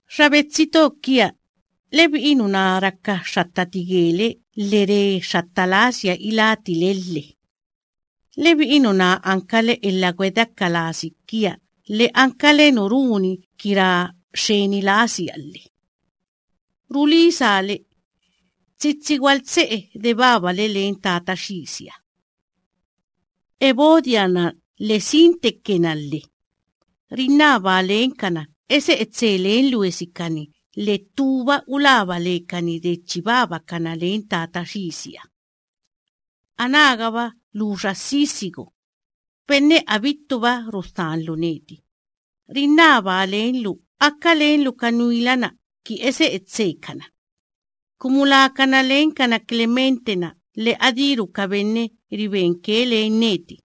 Xa betsi to kia, lebi'i nuná raka xxattati gele lhe re xxatta lasia iláti le lhe. Lebi'i nuná ankale elha gwedeaka lasi kia, lhe ankale nu runi ki ra xxeni lasia lhe. Rulisaa le, tsitsi gwaltse'e de chi babale len Tata Xisiha. Evodia‑na lhe Síntique‑na lhe, rinnabaa lenkana ese'e tse len luesikani, lhe ttúba ulaba lekani de chi babakana len Tata Xisiha. Anágaba lu xa Sísigo benne abittuba rudhanlu neti, rinnabaa lenlu aka lenlu ka nuila‑na kini ese'e tsekana, kumu lakana lenkana Clemente‑na lhe adíru ka benne ribenke len neti,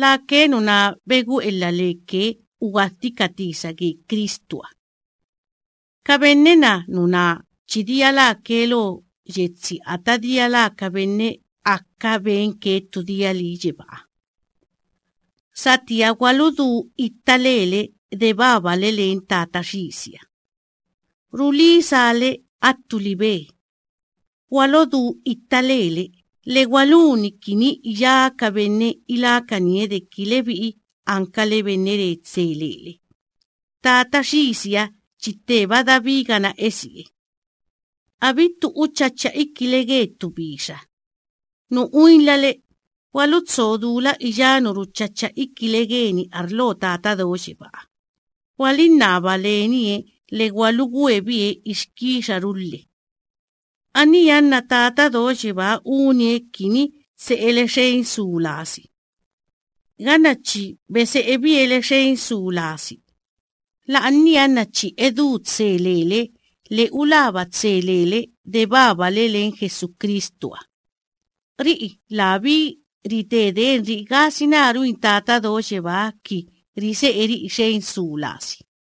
lake nuná begu'elha leke ki ugwadhi ka tisa ge Cristuha. Ka benne‑na nuná chi dia láke lo yetsi ata dia lá ka benne aka benke ttu dia lii yebáha. Satía gwaludú itta lele de chi babale len Tata Xisiha. Rulisaa le attu libe: gwalodú itta lele, lhe gwaluni kini iyá ka benne ilákanie deki lebi'i ankale benne re tse lele. Tata Xisiha chi tteba dabigana esie. Abittu uchacha ikile ge ttu bixa. Nu uinlale, gwalutso dula iyá nu ruchacha ikile geni arlo Tata Do Yebáha, gwalinnaba lenie lhe gwalugwe bie ixkixaru lhe. Aníha nna Tata Do Yebáha unie kini tse'ele xen su lasi. Ganna chi bese'ebie le xen su lasi, la'ania nna chi edú tse lele lhe ulaba tse lele de babale len Jesucristuha. Ri'i labí rite denri'i gasina ruin Tata Do Yebáha ki rise'eri'i xen su lasi.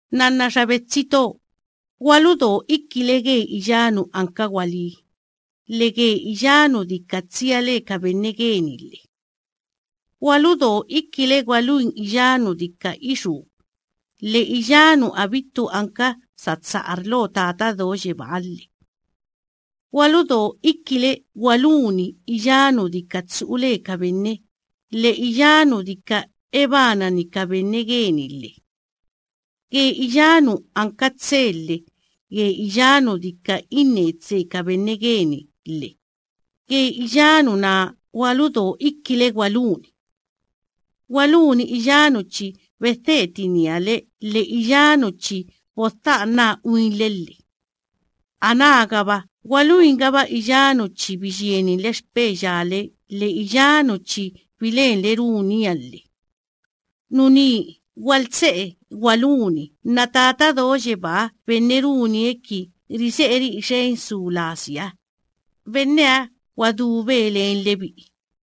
Nnanna xa betsi to, gwaludo ikile ge iyá nu anka gwalí, lhe ge iyá nu dika tsia le ka benne geni lhe. Gwaludo ikile gwaluni iyá nu dika ixú, lhe iyá nu abittu anka satsa arlo Tata Do Yebáha lhe. Gwaludo ikile gwaluni iyá nu dika tsu'u le ka benne, lhe iyá nu dika ebanani ka benne geni lhe. Ge iyá nu anka tse, lhe ge iyá nu dika inne tse ka benne geni lhe, ge iyá nuná gwaludo ikile gwaluni. Gwaluni iyá nu chi bedhetinia le lhe iyá nu chi bodha'anaa uinle lhe. Anágaba gwaluingaba iyá nu chi biyieninle xpeya le lhe iyá nu chi bilenle runia lhe. Nuní gwaltse'e gwaluni nna Tata Do Yebaa benne runie ki rise'eri'i xen su lasiha, benneha gwadúbe len lebi'i.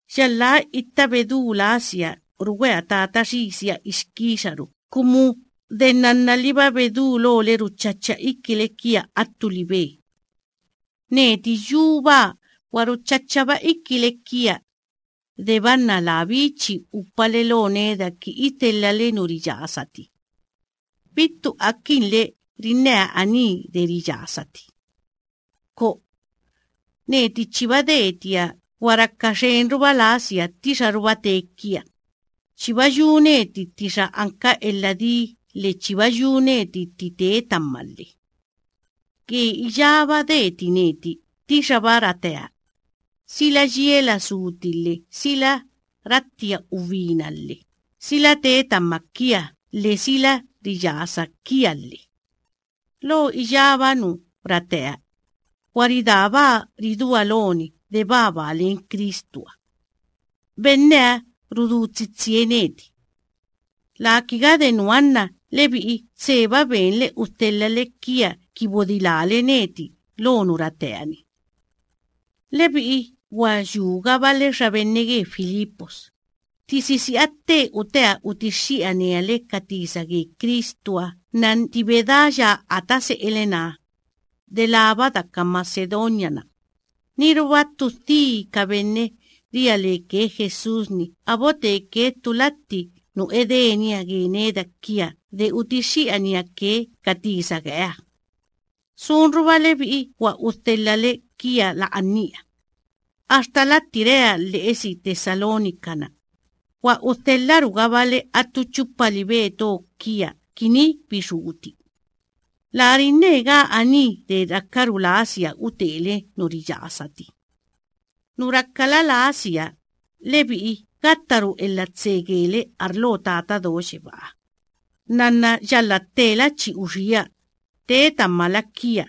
Yalhá itta bedú lasia rugwea Tata Xisiha ixkixaru, kumu de nnannaliba bedulole ruchacha ikile kia attu libe. Neti yubaa gwa ruchachaba ikile kia, deba nna labí chi upale lo neda ki idhelhale nu riyasati. Bittu akinle rinnea aní de riyasati. ¡Ko'o! Neti chiba detia gwa raka xenruba lasia ttixaruba tee kia. Chiba yu neti ttixa anka elha dii lhe chiba yu neti tti tee tama lhe. Ge iyába deti neti ttixaba ratea: sila yiela súti lhe sila rattia ubina lhe, sila tee tama kia lhe sila riyasa kia lhe. Lo iyába nu ratea, gwa ridaabaa ridúa loni de babaa len Cristuha. Benneha rudú tsitsie neti. Laa kiga de nuha nna lebi'i tseba benle udhelhale kia ki bodilále neti lo nu ratea. Lebi'i gwa yúgabale xa benne ge Filipos, tti sisi'a tte utea utixxi'ania le ka tisa ge Cristuha nna tti bedáya ata se'ele‑na, delába daka Macedonia‑na, niruba ttu dhi ka benne ria leke Jesús‑ni a boteke ttu latti nu edenia ge neda kia de utixxi'ania ke ka tisa geeha. Sunruba lebi'i gwa udhelhale kia la'ania. Axtala tti rea lhe'esi Tesalónica‑na gwa udhelharugabale attu chupa libe to kia kini bixúti. Laa rinnegaa aní de rakaru lasia utele nu riyasati. Nu rakala lasia, lebi'i gattaru elha tse gele arlo Tata Do Yebáha. Nnanna yalhá ttela chi uxía, tee tamala kia.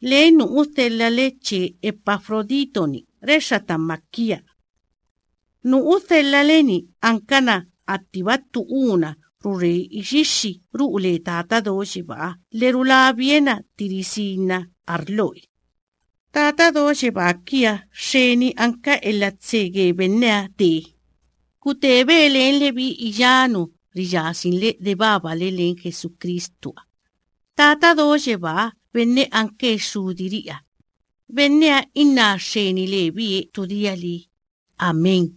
Len nu udhelhale che Epafrodito‑ni rexxa tama kia. Nu udhelhale‑ni ankana attiba ttu úna rure ixixxi ru'u le Tata Do Yebáha lhe rulabie na tti risinna arloe. Tata Do Yebaa kiaha xxeni anka elha tse ge benneha tee. Gutebe len lebi'i iyá nu riyasinle de babale len Jesucristuha. Tata Do Yebaa benne anke Xxudiri'iha, benneha inná xxeni lebie ttu dia lii. Amén.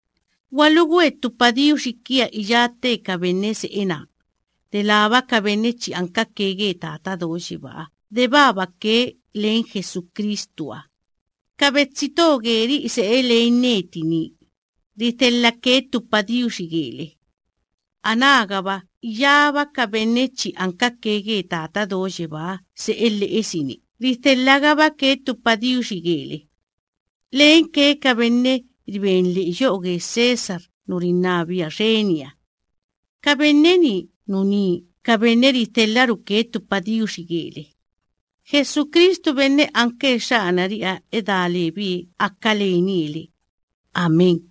Gwalugwe ttu padiuxi kia iyá tte ka benne se'e naa, delába ka benne chi ankake ge Tata Do Yebáha de babake len Jesucristuha. Ka betsi to geri'i se'e len neti nii, ridhelhake ttu padiuxi gele. Anágaba iyába ka benne chi ankake ge Tata Do Yebáha se'e lhe'esi‑ni, ridhelhagabake ttu padiuxi gele, lenke ka benne riben lhe'e yo'o ge César nu rinnabia xeniha. Ka benne‑ni nuní ka benne ridhelharuke ttu padiuxi gele. Jesucristu benne anke Xxanari'iha edá lebie aka lenie le. Amén.